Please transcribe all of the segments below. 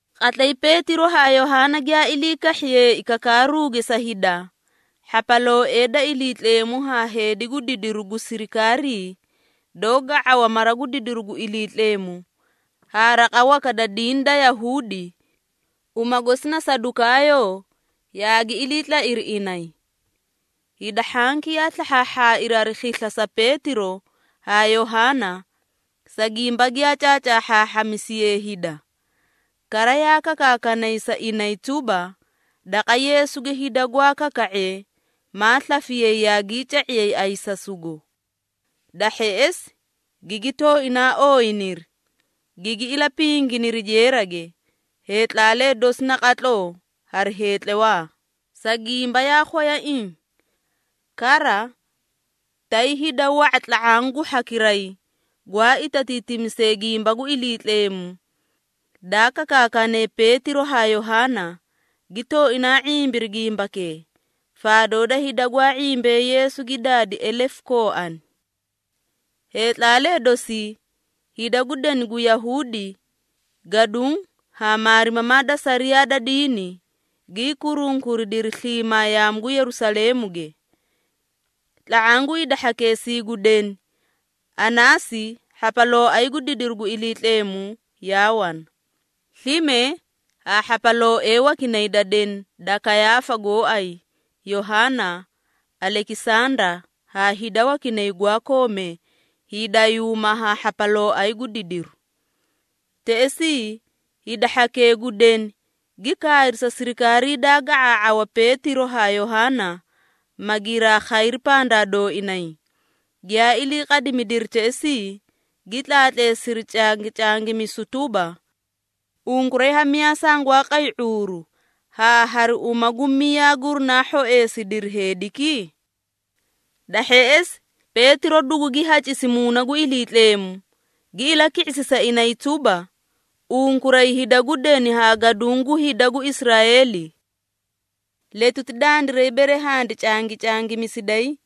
Qatlay Peetiro haa Yohaana giyaa ilii kahhiyeei kakaaruge sa hida, hhapalooee da Iliitleemu haa heedi gu didiru gu sirikaarii doó ga⁄awa mara gu didiru gu Iliitleemu haa raqa waka da diini da Yahuudi, uma gosi na Sadukaayoo yaagi ilii tlairi inay. Hida hhanki yaa slahhaahhaairi hari khisla sa Peetiro haa Yohaana, sa gimba giyaa caacaahhaahhamisiyee hida. Kara yaa kakaakanay sa inay tuba, daqa Yeesuge hida gwaa kaka⁄ee maa slafiyay yaagii ca⁄iyay ayisasugo. Da hheꞌesi gigi tooinaa ooyiniri, gigi ilapinginiri jeerage heetlaalee dosi naqatloo hari heetlawaa, sa gimba yaa khwayaiĩ. Kara, tay hida wa⁄a tla⁄aã gu hhakiray gwaa itatiitimisee gimba gu Iliitleemu daa kakaakane Peetiro haa Yohaana, gi tooinaa ⁄imbiri gimbakee, faadoo da hida gwaa ⁄imbee Yeesu gi daadi elefu kooani. Heetlaalee dosii, hida gu deni gu Yahuudi, gaduũ haa maarimamaa da sariyaa da diini, gii kurunkuridiri sliimaa yaamu gu Yerusaleemuge. Tla⁄aã gu hida hhakeesii gu deni, Anaasi hhapalooay gu didiru gu Iliitleemu yaa wana. Slime haa hhapalooee wakinay da deni da Kayaafa gooay, Yohaana, Alekisanda haa hida wakinay gwaa koomee hiidayuuma haa hhapalooay gu didiru. Teꞌesii, hida hhakee gu deni gi kaayri sa sirikaarii daa ga⁄aa⁄awa Peetiro haa Yohaana, ma giraa khayri pandaa dooinay, giyaa ilii qadimidiri teꞌesii, gi tlaatleesiri cangicangimisu tuba, “Unkuray ha miyaa sangwaa qay ⁄uuru haa hari uma gu miyaa gurinaa hhoeesidiri heediki?” Da hheꞌesi Peetiro dugugi hacisi Muuna gu Iliitleemu, gi ilaki⁄isi sa inay tuba, “Unkuray hida gu deni haa gaduũ gu hida gu Israeeli! Letuti dandiray bere handi cangicangimisiday,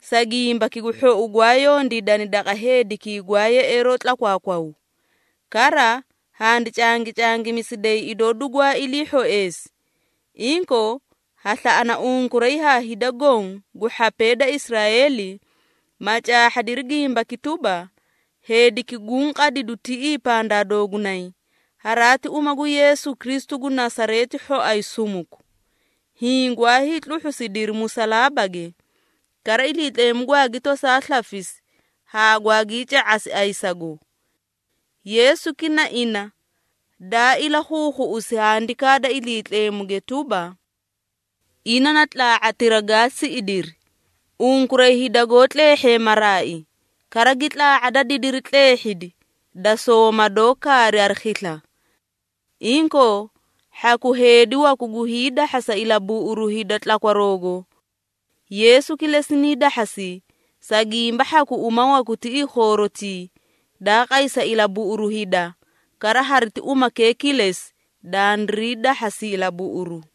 sa gimbaki gu hhou gwaa yondiidani daqa heedikii gwaa yeꞌeeroo tlakwaakwaw, kara handi cangicangimisiday idoo dugwaa ilii hhoeesi, inkoo ha slaꞌana unkuray haa hida goõ gu hhapee da Israeeli, ma caahhadiri gimbaki tuba, ‘Heediki guũ qadidu tiꞌii pandaa doogunay, haraati uma gu Yeesu Kristu gu Nasareeti hhoay sumuku. Hiĩ gwaa hiitluhhusidiri musalaabage, kara Iliitleemu gwaagi tosaa slafisi haa gwaagii ca⁄asi ayisago!’ Yeesuki na ina daa ilakhuukhuꞌusi Handikaa da Iliitleemuge tuba, ‘Ina na tlaa⁄atira gaa siꞌidiri unkuray hida goó tleehhee maraai, kara gi tlaa⁄a da didiri tleehhidi da sooma doó kaari hari khisla.’ Inkoo, hhaku heedi waku gu hiidahhasa ilabuꞌuru hida tlakwaroogo. Yeesu kilesi nii dahhasi, sa gimba hhaku uma waku tiꞌii khoorotii, daa qay sa ilabuꞌuru hida, kara hariti umakee kilesi, dandirii dahhasi ilabuꞌuru.”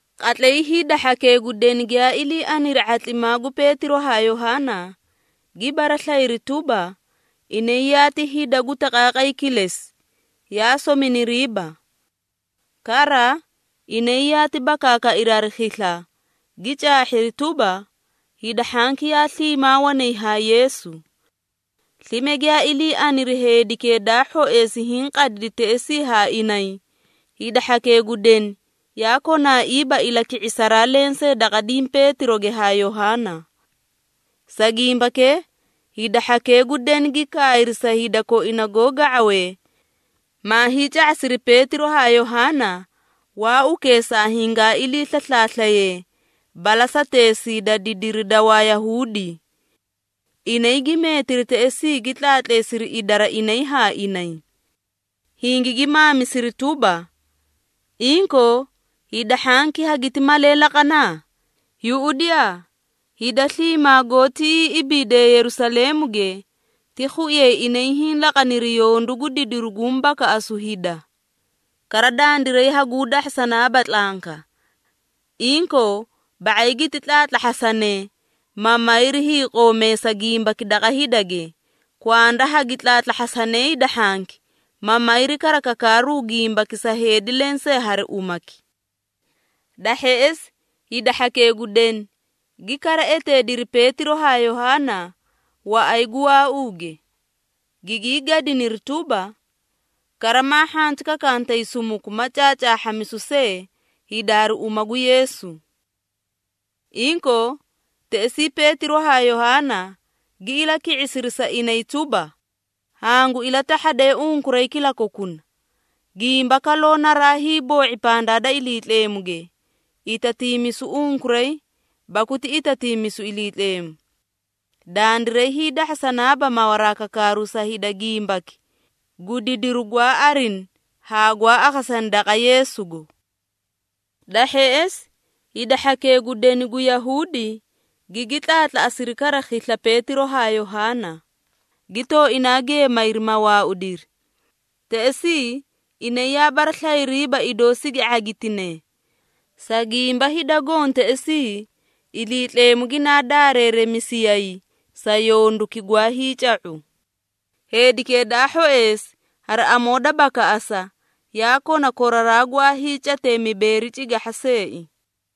Qatlay hida hhakee gu deni giyaa ilii aniri ⁄atlimaa gu Peetiro haa Yohaana, gi baraslayiri tuba, inay yaati hida gu taqaaqay kilesi, yaa sominiriiba. Kara, inay yaati bakaakairi hari khisla, gi caahhiri tuba, hida hhanki yaa sliimaa wanay haa Yeesu. Slime giyaa ilii aniri heedikee daa hhoeesi hiĩ qadidi teꞌesii haa inay, hida hhakee gu deni yaa konaaiiba ilaki⁄isaraa lensee daqa diĩ Peetiroge haa Yohaana. Sa gimbakee hida hhakee gu deni gi kaayri sa hida koina goó ga⁄awee, maa hiica⁄asiri Peetiro haa Yohaana waaukeesaa hingaa ilii slaslaaslayee balasateesii da didiri da Wayahuudi. Inay gi meetiri teꞌesii gi tlaatleesiri idara inay haa inay, Hingigi maamisiri tuba, “Inkoo, hida hhanki hagiti malee laqana? Yuꞌudiyaa, hida sliimaa goó tiꞌii ibiidee Yerusaleemuge ti khuiyay inay hiĩ laqaniri yondu gu didiru guũ bakaꞌasu hida, kara dandiray haguu dahhasanaaba tlanka. Inkoo, ba⁄ay giti tlaatlahhasanee, ma mayri hiiqoomeesa gimbaki daqa hidage, kwanda hagi tlaatlahhasane hida hhanki, ma mayri kara kakaaru gimbaki sa heedi lensee hari umaki.” Da hheꞌesi hida hhakee gu deni, gi kara eteediri Peetiro haa Yohaana waꞌay gu waauuge, gigii gadiniri tuba, “Kara maa hhanti kakantay sumuku ma caacaahhamisu see hida hari uma gu Yeesu.” Inkoo, teꞌesii Peetiro haa Yohaana gi ilaki⁄isiri sa inay tuba, “Hangu ilatahhadee unkuray kilakokuna. Gimba kaloo naraa hiiboo⁄i pandaa da Iliitleemuge, itatiimisu unkuray baku ti itatiimisu Iliitleemu. Dandiray hiidahhasanaaba mawaraa kakaaru sa hida gimbaki gu didiru gwaa arini haa gwaa akhasani daqa Yeesugo.” Da hheꞌesi hida hhakee gu deni gu Yahuudi gigi tlaatlaꞌasiri kara khisla Peetiro haa Yohaana, gi tooinaa geemayri ma waaudiri. Teꞌesii inay yaa baraslayiriiba idoo sigi ⁄agitine, sa gimba hida goõ teꞌesii Iliitleemu ginaa daareeremisiyay sa yonduki gwaa hiica⁄u. Heedikee da hhoeesi hari amoo da bakaꞌasa, yaa kona koraraa gwaa hiicatee mibeeri cigahha seei.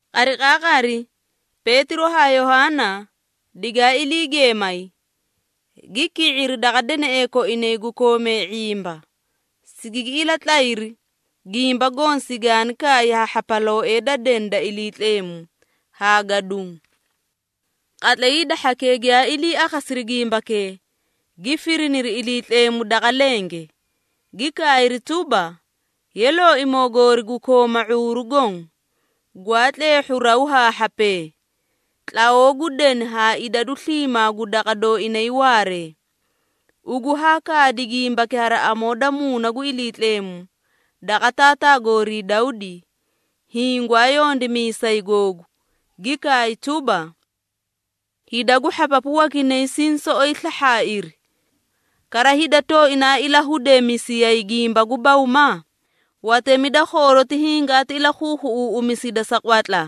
Qariqaaqari Peetiro haa Yohaana digaa ilii geemay, gi ki⁄iri daqa deneꞌee koinay gu koomee ⁄imba, sigigi ilatlayri gimba goõ sigaani kaay ha hhapalooee da deni da Iliitleemu haa gaduũ. Qatlay hida hhakee giyaa ilii akhasiri gimbakee, gi firiniri Iliitleemu daqa lenge, gi kaayri tuba, “Ye Looimoo goori gu kooma ⁄uuru goõ, gwaa tleehhu raw haa hhapee, tlawoo gu deni haa idadu sliimaa gu waꞌay koinay waaree, ugu haa kaadi gimbaki hari amoo da Muuna gu Iliitleemu daqa taataa goorii Dawdi, hiĩ gwaa yondimiisay googu, gi kaay tuba, ‘Hida gu hhapapu wakinay siĩ soꞌoy slahhaairi, kara hida tooinaa ilahudeemisiyay gimba gu bawma? Watemi da khooroti hingii ilakhuukhuꞌusiri sa qwatla,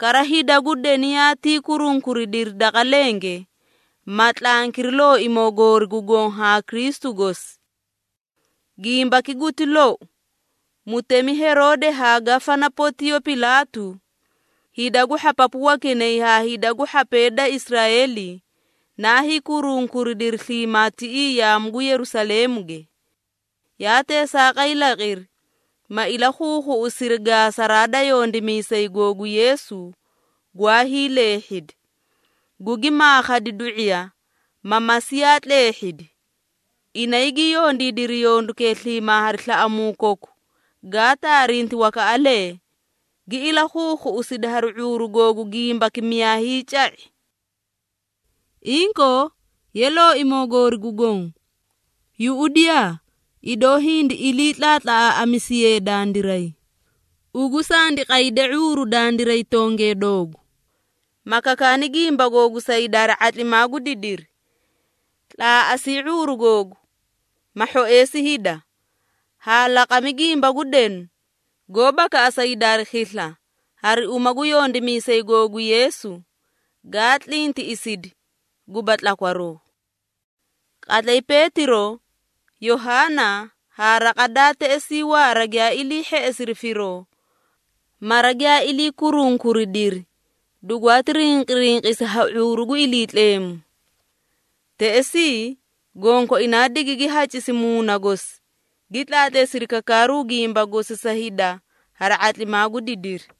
kara hida gu deni goó tawaalimee hingii kurunkuridiri daqa lenge, ma tlankiri Looimoo goori gu Goõ haa Kristu gosi.’ Gimbaki guti lou! Mutemi Heroode haa Gafana Pontiyo Pilaatu, hida gu hhapapu wakinay haa hida gu hhapee da Israeeli naa hiikurunkuridiri sliimaa tiꞌii yaamu gu Yerusaleemuge. Yaa teesaaqay laqiri, ma ilakhuukhuꞌusiri gaasaraa da yondimiisay googu Yeesu gwaa hiileehhedi, gugi maakhadi du⁄iya, ma Masiiya tleehhidi. Inay gi yondiidiri yondukee sliimaa hari slaꞌamuu koku gaa taarinti wakaꞌalee, gi ilakhuukhuꞌusidi hari ⁄uuru googu gimbaki miyaa hiica⁄i. Inkoo, Ye Looimoo goori gu Goõ, yuꞌudiyaa, idoo hindi ilii tlaatlaꞌamisiyee dandiray. Ugu sandi qayde ⁄uuru dandiray tongee doogu, ma kakaani gimba googu sa hida hari ⁄atlimaa gu didiri. Tlaaꞌasii ⁄uuru googu, ma hhoeesi hida haa laqami gimba gu denu goó bakaꞌasa hida hari khisla hari uma gu yondimiisay googu Yeesu, gaa tlintiꞌisidi guba tlakwaroo.” Qatlay Peetiro, Yohaana haa raqa daa teꞌesii waara giyaa ilii hheꞌesiri firoo, mara giyaa ilii kurunkuridiri dugwaati rinqirinqisi ha ⁄uuru gu Iliitleemu. Teꞌesii, gonkoinaa digigi hacisi Muuna gosi, gi tlaatleesiri kakaaru gimba gosi sa hida hari ⁄atlimaa gu didiri.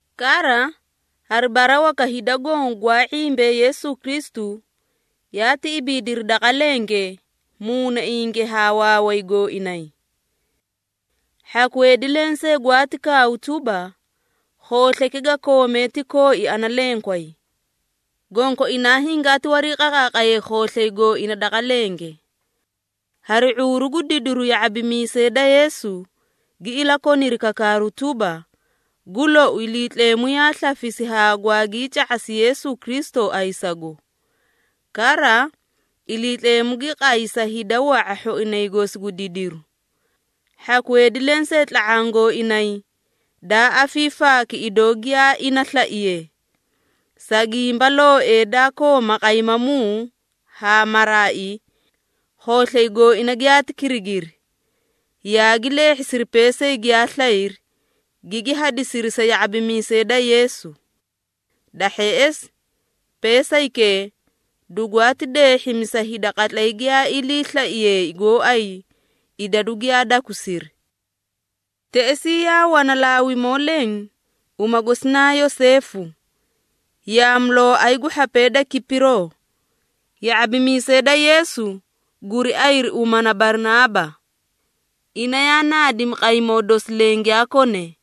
Kara, hari bara waka hida goõ gwaa ⁄imbee Yeesu Kristu, yaati ibiidiri daqa lenge muunainge haa waaway gooinay. Hhaku heedi lensee gwaati kaaw tuba, khooslayki ga koome ti kooi ana lenkway, gonkoinaa hingaati wariiqaqaaqayay khooslay gooina daqa lenge. Hari ⁄uuru gu didiru ya⁄abimiisee daa Yeesu, gi ilakoniri kakaaru tuba, gu lou Iliitleemu yaa slafisi haa gwaagii ca⁄asi Yeesu Kristu ayisago. Kara Iliitleemu gi qay sa hida wa⁄a hhoinay gosi gu didiru. Hhaku heedi lensee tla⁄aã gooinay daa afiifaaki idoo giyaa ina slaiye. Sa gimba looee daa kooma qaymamuu haa maraai, khooslay gooina giyaati kirigiri, yaagi leehhisiri peesay giyaa slayri, gigi hadisiri sa ya⁄abimiisee da Yeesu. Da hheꞌesi peesaykee dugwaati deehhimi sa hida qatlay giyaa ilii slaiyeei gooay idadu giyaa dakusiri. Teꞌesii yaa wana Laawimoo leẽ, uma gosi naa Yoseefu, yaamulooay gu hhapee da Kipiroo. Ya⁄abimiisee da Yeesu guri ayiri uma na Barinaaba. Ina yaa naadimi qaymoo dosi leẽ giyaa kone,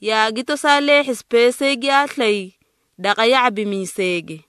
yaagi tosaa leehhisi peesay giyaa slay daqa ya⁄abimiiseege.